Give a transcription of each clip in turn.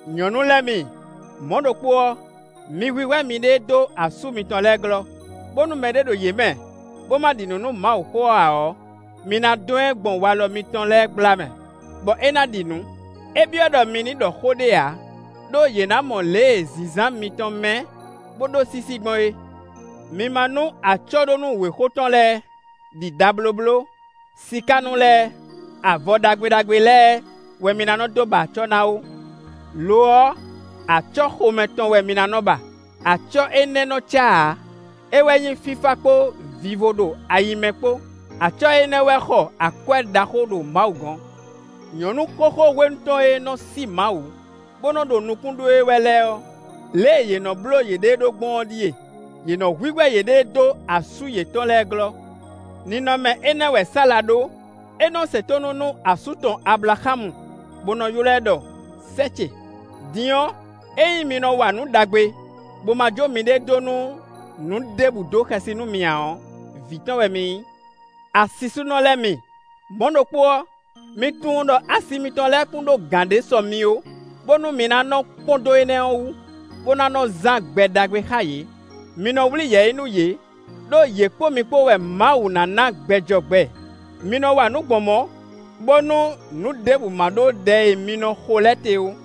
Nyɔ̌nu lɛ́ɛ mi, mɔ̌ ɖokpó ɔ́, mi hwíhwɛ́ miɖée dó asú mitɔn lɛ́ɛ glɔ́, bónú mɛɖé ɖo yě mɛ, bó má ɖi nǔ nú Mawuxó ɔ́ ǎ ɔ́, mi ná dɔn ɛ gbɔn walɔ mitɔn lɛ́ɛ gbla mɛ, bɔ é ná ɖi nǔ. É byɔ́ ɖɔ mi ní ɖɔ xó ɖé ǎ; ɖó yě ná mɔ lě e zǐnzán mitɔn mɛ́, bó ɖó sísí gbɔn é. Mi ma nú acɔ́ɖónú wěxo tɔn lɛ́ɛ ɖi ɖablóbló, sikánú lɛ́ɛ, avɔ ɖagbe ɖagbe lɛ́ɛ wɛ mi ná nɔ́ dó ba acɔ́ ná ó. Lo ɔ́, acɔ́ xomɛ tɔn wɛ mi ná nɔ́ ba; acɔ́ énɛ́ nɔ cá ǎ; é wɛ nyí fífá kpó vivo ɖo ayi mɛ kpó; acɔ́ énɛ́ wɛ xɔ akwɛ́ ɖaxó ɖo Mawu gɔ̌n. Nyɔ̌nu xóxó hwenu tɔn e nɔ sí Mawu, bó nɔ́ ɖo nukún ɖó e wɛ lɛ́ɛ ɔ́, lě e yě nɔ́ bló yěɖée ɖó gbɔn ɔ́ ɖíe: yě nɔ hwíhwɛ́ yěɖée dó asú yětɔn lɛ́ɛ glɔ́. Ninɔmɛ énɛ́ wɛ Sala ɖó; é nɔ se tónú nú asú tɔn Ablaxámu bó nɔ́ ylɔ́ ɛ ɖɔ: “Sɛ́ ce”. Din ɔ́, ényí mi nɔ wa nǔ ɖagbe, bó ma jó miɖée dó nú nǔ ɖěbǔ dó xɛsi nú mi ǎ ɔ́, vǐ tɔn wɛ mi nyí. Asisúnɔ lɛ́ɛ mi, mɔ̌ ɖokpó ɔ́, mi tunwun ɖɔ asi mitɔn lɛ́ɛ kún ɖó gǎn ɖé sɔ mi ó, bónú mi ná nɔ kpɔ́n dó énɛ́ ɔ́ wú, bó ná nɔ zán gbɛ ɖagbe xá yě; mi nɔ wlí yɛ̌yi nú yě, ɖó yě kpó mi kpó wɛ Mawu ná ná gbɛ jɔ gbɛ. Mi nɔ wa nǔ gbɔn mɔ̌, bónú nǔ ɖěbǔ ma ɖó ɖɛ e mi nɔ xo lɛ́ɛ te ó.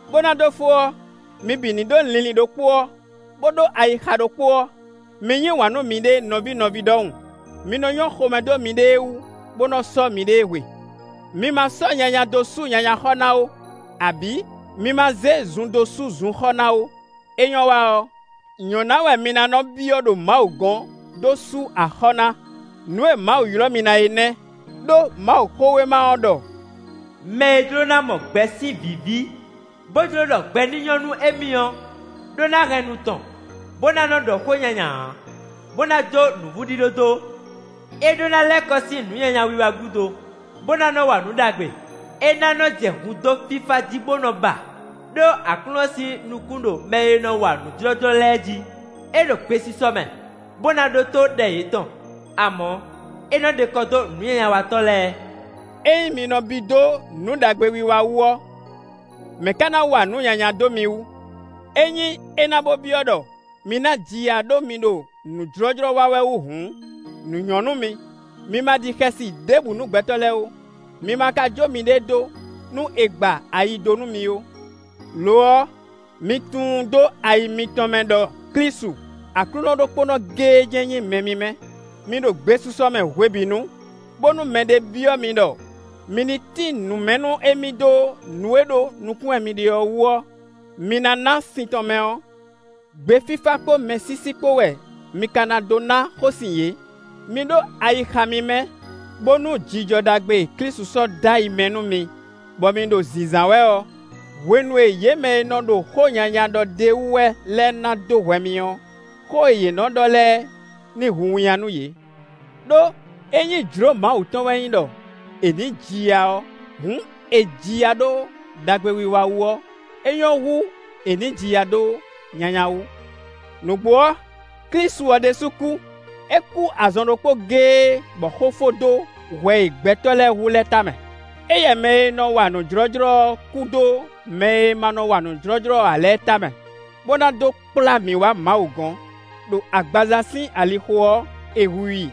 Bó ná dó fó ɔ́, mi bǐ ní ɖó linlin ɖokpó ɔ́, bó ɖó ayixa ɖokpó ɔ́; mi yí wǎn nú miɖée nɔví nɔví ɖɔhun; mi nɔ nyɔ́ xomɛ dó miɖée wú, bó nɔ sɔ́ miɖée hwe. Mi ma zé nyanya dó sú nyanya xɔ ná ó, abǐ mi ma zé zun dó sú zun xɔ ná ó; é nyɔ́ wa ɔ́, nyɔ̌ná wɛ mi ná nɔ byɔ́ ɖo Mawu gɔ́n dó sú axɔ́ ná; nǔ e Mawu ylɔ́ mi ná é nɛ́. Đó Mawuxówéma ɔ́ ɖɔ: “Mɛ e jló ná mɔ gbɛ sín vǐví, bó jló ɖɔ gbɛ ní nyɔ́ nú émí ɔ́ ɖó ná hɛn nu tɔn, bó ná nɔ́ ɖɔ xó nyanya ǎ, bó ná jó nǔvúɖíɖó dó. É ɖó ná lɛ́ kɔ sín nǔ nyanya wiwa gúdo, bó ná nɔ wa nǔ ɖagbe; é ná nɔ́ jɛ hun dó fífá jí bó nɔ ba; ɖó Aklúnɔ sín nukún ɖo mɛ e nɔ wa nǔ jlɔ́jlɔ́ lɛ́ɛ jí, é ɖo gbesisɔ mɛ, bó ná ɖótó ɖɛ yětɔn. Amɔ̌, é nɔ ɖe kɔ dó nǔnyanyawatɔ́ lɛ́ɛ.” Ényí mi nɔ bí dó nǔ ɖagbe wiwa wú ɔ́, mɛ̌ ka ná wa nǔ nyanya dó mi wú? Ényí é ná bó byɔ́ ɖɔ mi ná ji ya ɖó mi ɖo nǔ jlɔ́jlɔ́ wa wɛ wú hǔn, nǔ nyɔ́ nú mi. Mi ma ɖi xɛsi ɖěbǔ nú gbɛtɔ́ lɛ́ɛ ó; mi ma ka jó miɖée dó nú è gba ayi dó nú mi ó. Lo ɔ́, mi tunwun dó ayi mitɔn mɛ ɖɔ Klísu Aklúnɔ ɖokpónɔ géé jɛ́n nyí Mɛ mímɛ́. Mi ɖo gbesisɔ mɛ hwebǐnu, bónú mɛɖé byɔ́ mi ɖɔ mi ní tín nǔ mɛ nú émí dó nǔ e ɖó nukún wɛ mi ɖe ɔ́ wú ɔ́, mi ná ná sin tɔn mɛ ɔ́. Gbe fífá kpó mɛsísí kpó wɛ mi ka ná dó ná xósin yě. Mi ɖó ayixa mímɛ́, bónú jijɔ ɖagbe e Klísu sɔ́ dó ayi mɛ nú mi, bɔ mi ɖo zǐnzán wɛ ɔ́, hwenu e yě mɛ e nɔ ɖo xó nyanya ɖɔ d'é wú wɛ lɛ́ɛ ná dó hwɛ mi ɔ́, xó e yě nɔ ɖɔ lɛ́ɛ ní hu winnyá nú yě. Đó ényí jlǒ Mawu tɔn wɛ nyí ɖɔ è nǐ ji ya ɔ́, hǔn è ji ya ɖó ɖagbewiwa wú ɔ́, é nyɔ́ hú è nǐ ji ya ɖó nyanya wú. Nǔgbó ɔ́, Klísu ɔ́ ɖésú kú; é kú azɔn ɖokpó géé bɔ xó fó dó hwɛ e gbɛtɔ́ lɛ́ɛ hu lɛ́ɛ tamɛ; éyɛ́ mɛ e nɔ wa nǔ jlɔ́jlɔ́ ɔ́ kú dó mɛ e ma nɔ wa nǔ jlɔ́jlɔ́ ǎ lɛ́ɛ tamɛ, bó ná dó kplá mi wá Mawu gɔ̌n; ɖo agbaza sín alixo ɔ́, è hu i;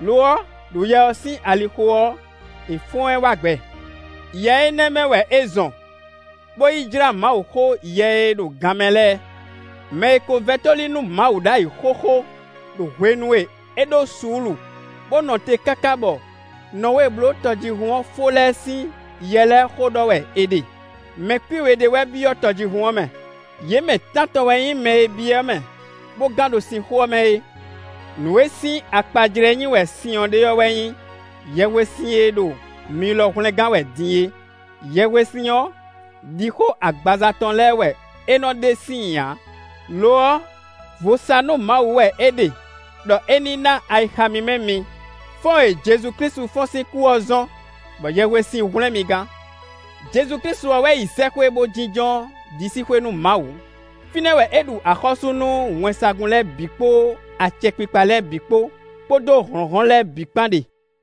lo ɔ́, ɖo Yɛ ɔ́ sín alixo ɔ́, è fɔ́n ɛ wá gbɛ. Yɛ énɛ́ mɛ wɛ é zɔn bó yi jlá Mawuxó yɛ e ɖo gan mɛ lɛ́ɛ. Mɛ e ko vɛ́ tóli nú Mawu ɖ'ayǐ xóxó ɖo hwenu e é ɖó suúlu bó nɔ te káká bɔ Nɔwée bló tɔjíhún ɔ́ fó lɛ́ɛ sín yɛ lɛ́ɛ xó ɖɔ wɛ è ɖe. Mɛ kwín we ɖé wɛ byɔ́ tɔjíhún ɔ́ mɛ: yě mɛ tántɔn wɛ nyí mɛ e byɔ́ mɛ bó gán ɖo sin xó ɔ́ mɛ é. Nǔ e sín akpajlɛ́ nyí wɛ sin ɔ́ ɖe ɔ́ wɛ nyí yɛhwesin e ɖo mi lɔ hwlɛngán wɛ din e. Yɛhwesin ɔ́, ɖixó agbaza tɔn lɛ́ɛ wɛ é nɔ ɖe síin ǎ, lo ɔ́ vo sa nú Mawu wɛ é ɖe ɖɔ é ní ná ayixa mímɛ́ mi. Fɔ́n e Jezu Klísu fɔ́n sín kú ɔ́ zɔ́n bɔ yɛhwesin hwlɛ́n mi gán. Jezu Klísu ɔ́ wɛ yi sɛ́xwé bó jínjɔ́n ɖisíxwé nú Mawu; fínɛ́ wɛ é ɖu axɔ́sú nú wɛnsagun lɛ́ɛ bǐ kpó acɛkpikpa lɛ́ɛ bǐ kpó, kpódó hlɔ̌nhlɔ́n lɛ́ɛ bǐ kpán ɖe.